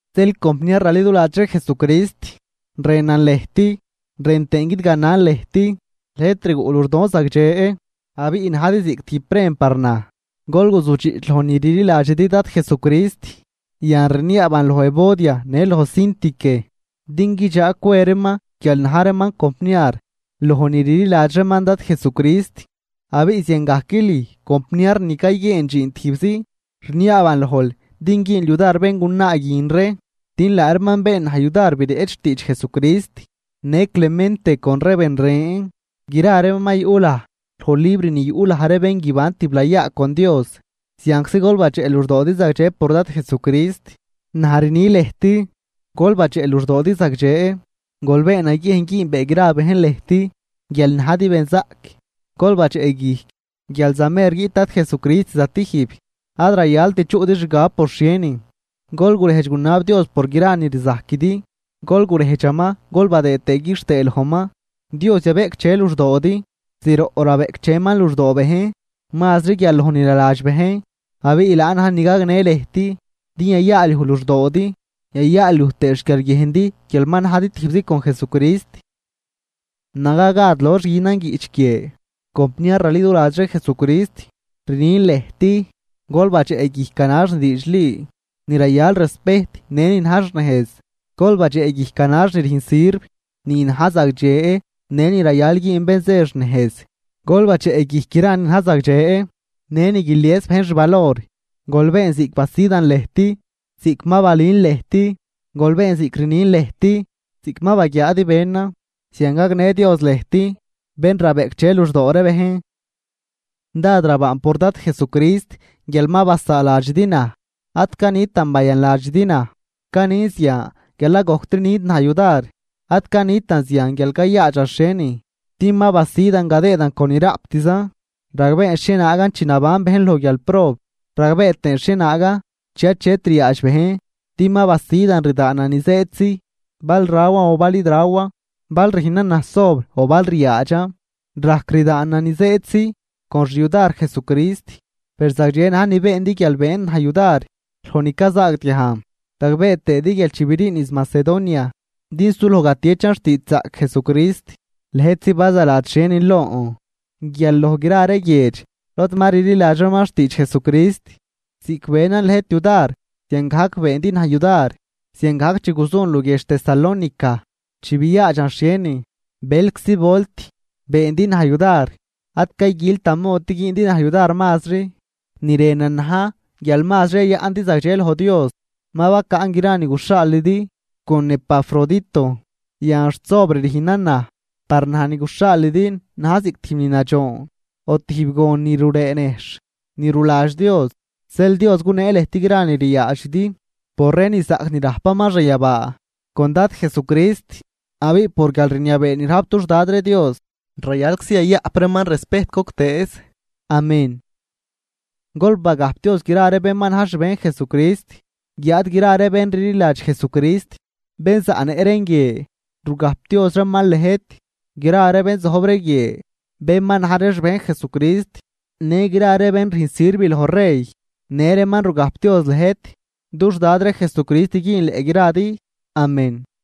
Zeel compniar raliduladx ree Jesucrist, rënan lëjt rën tëën guidganan lëjt, lëjt rguꞌ luxdon zagdxe, abiꞌ najdi ziꞌc tijb prem par naj, gol guzujdxiꞌch loj ni rliladxidi Dad Jesucrist. Yan, rniaaban loj Evodia në loj Síntique din guidxag cwe reeman guial na̱j reeman compniar loj ni rliladx reeman Dad Jesucrist. Abiꞌ ziangajc lüj compniar ni cayguieen dxiin tijbzi, rniaaban lojl din güünl yudar béngunaa guin ree din laa reeman been naj yudar bireꞌch xtiidx Jesucrist në Clemente con ree ben ren, gra reeman ma yuꞌ laj loj libr ni yuꞌ laj ree bén guiban tiblayaa con Dios. Zianczi gol badxeꞌ luxdoodi zagdxe por Dad Jesucrist. Naj rni lëjt ¡Gol badxeꞌ luxdoodi zagdxe! Gol been naguiejn güünbee gra bejn lëjt guial najdi benzaꞌc. Gol badxeꞌguijc guial zamer guiꞌt Dad Jesucrist zatijb. Ad rayalt chuꞌdi xgab por xhienin, gol gurejdx gunab Dios por gra ni rzajquidi, gol gurejdxaman gol badëë tëë quixtëë lojman. Dios yabeꞌcdxe luxdoodi, zroꞌ rabeꞌcdxeman luxdoo bejn mazri guial loj ni naladx bejn, abiꞌ laan na̱j ni gagnë lëjt din yayaalyuj luxdoodi yayaalyuj tëë xquiarguiejndi guial ma najdi tijbzi con Jesucrist. Naga gad lox günan guiꞌch guie, compniar raliduladx ree Jesucrist, rnin lëjt gol badxeꞌguijc ganax ni diidxli, ni rayal respejt në ni na̱j xnejz. Gol badxeꞌguijc ganax ni rüjn sirv, ni na̱j zagdxe në ni rayal güün bén zë xnejz. Gol badxeꞌguijc gra ni na̱j zagdxe në ni guilies bejn xvalor. Gol been ziꞌc basidan lëjt, ziꞌc ma balün lëjt, gol been ziꞌc rnin lëjt ziꞌc ma baguiaadi benan, zian gagnë Dios lëjt bén rabeꞌcdxe luxdoo ree bejn. Dád rabaan por Dad Jesucrist guial ma basaaladxidi naj. Ad canitan bayanladxidi naj, canin zian guial ad gojctri nüjndi naj yudar. Ad canitan zian guial cayaadxan xhienin din ma basidan gadëëdan con ni raꞌptzan. Ragbeen xhienaagan chi naban bejn loj guialprob ragbee tëën xhienaagan chi achet ryaadx bejn, din ma basidan rdaanan ni zëëdtzi, bal rawan o bal id rawan, bal rüjnan naj sobr o bal ryaadxan. Rajc rdaanan ni zëëdtzi con xyudar Jesucrist. Per zagdxe na̱j ni beendi guial beendi naj yudar loj ni cazaagdiajn. Ragbee tëëdi guial chi briin niz Macedonia din suloj gatieꞌchan xtiidxzaꞌc Jesucrist, lëjtzi bazaladx xhienin lon guial loj gra ree guiedx lod ma rliladx reeman xtiidx Jesucrist, ziꞌc benan lëjt yudar ziangajc beendi naj yudar. Ziangajc chi guzun luguiedx Tesalónica chi biaadxan xhienin, bëlczi volt beendi naj yudar. Ad cayguiltan mod din güündi naj yudar mazri, ni rënan na̱j guial mazri yayaꞌndi zagdxe loj Dios. Ma bacaꞌn gra ni guxhaalidi con Epafrodito, yan xt sobr rüjnan naj, par naj ni guxhaalidi na̱j ziꞌc tijb ni nadxoon o tijb gon ni ruree nejxh, ni ruladx Dios. Zeel Dios gunee lëjt gra ni ryaadxidi por ree ni zaꞌc ni rajpaman xanyabaa con Dad Jesucrist. ¡Abiꞌ por guialrniabee ni rajp dux Dad ree Dios, rayalczi yayaꞌp reeman respejt goctëëz! Amén. Gol bagajpdioz gra ree bén ma na̱j xbejn Jesucrist, guiáad gra ree bén rliladx Jesucrist bén zaꞌnëꞌ reen guie, rugajpdioz reeman lëjt. Gra ree bén zojb ree guie, bén ma na̱j ree xbejn Jesucrist, në gra ree bén rüjn sirv loj rey, në reeman rugajpdioz lëjt. Dux Dad ree Jesucrist güünleꞌ gradi. Amén.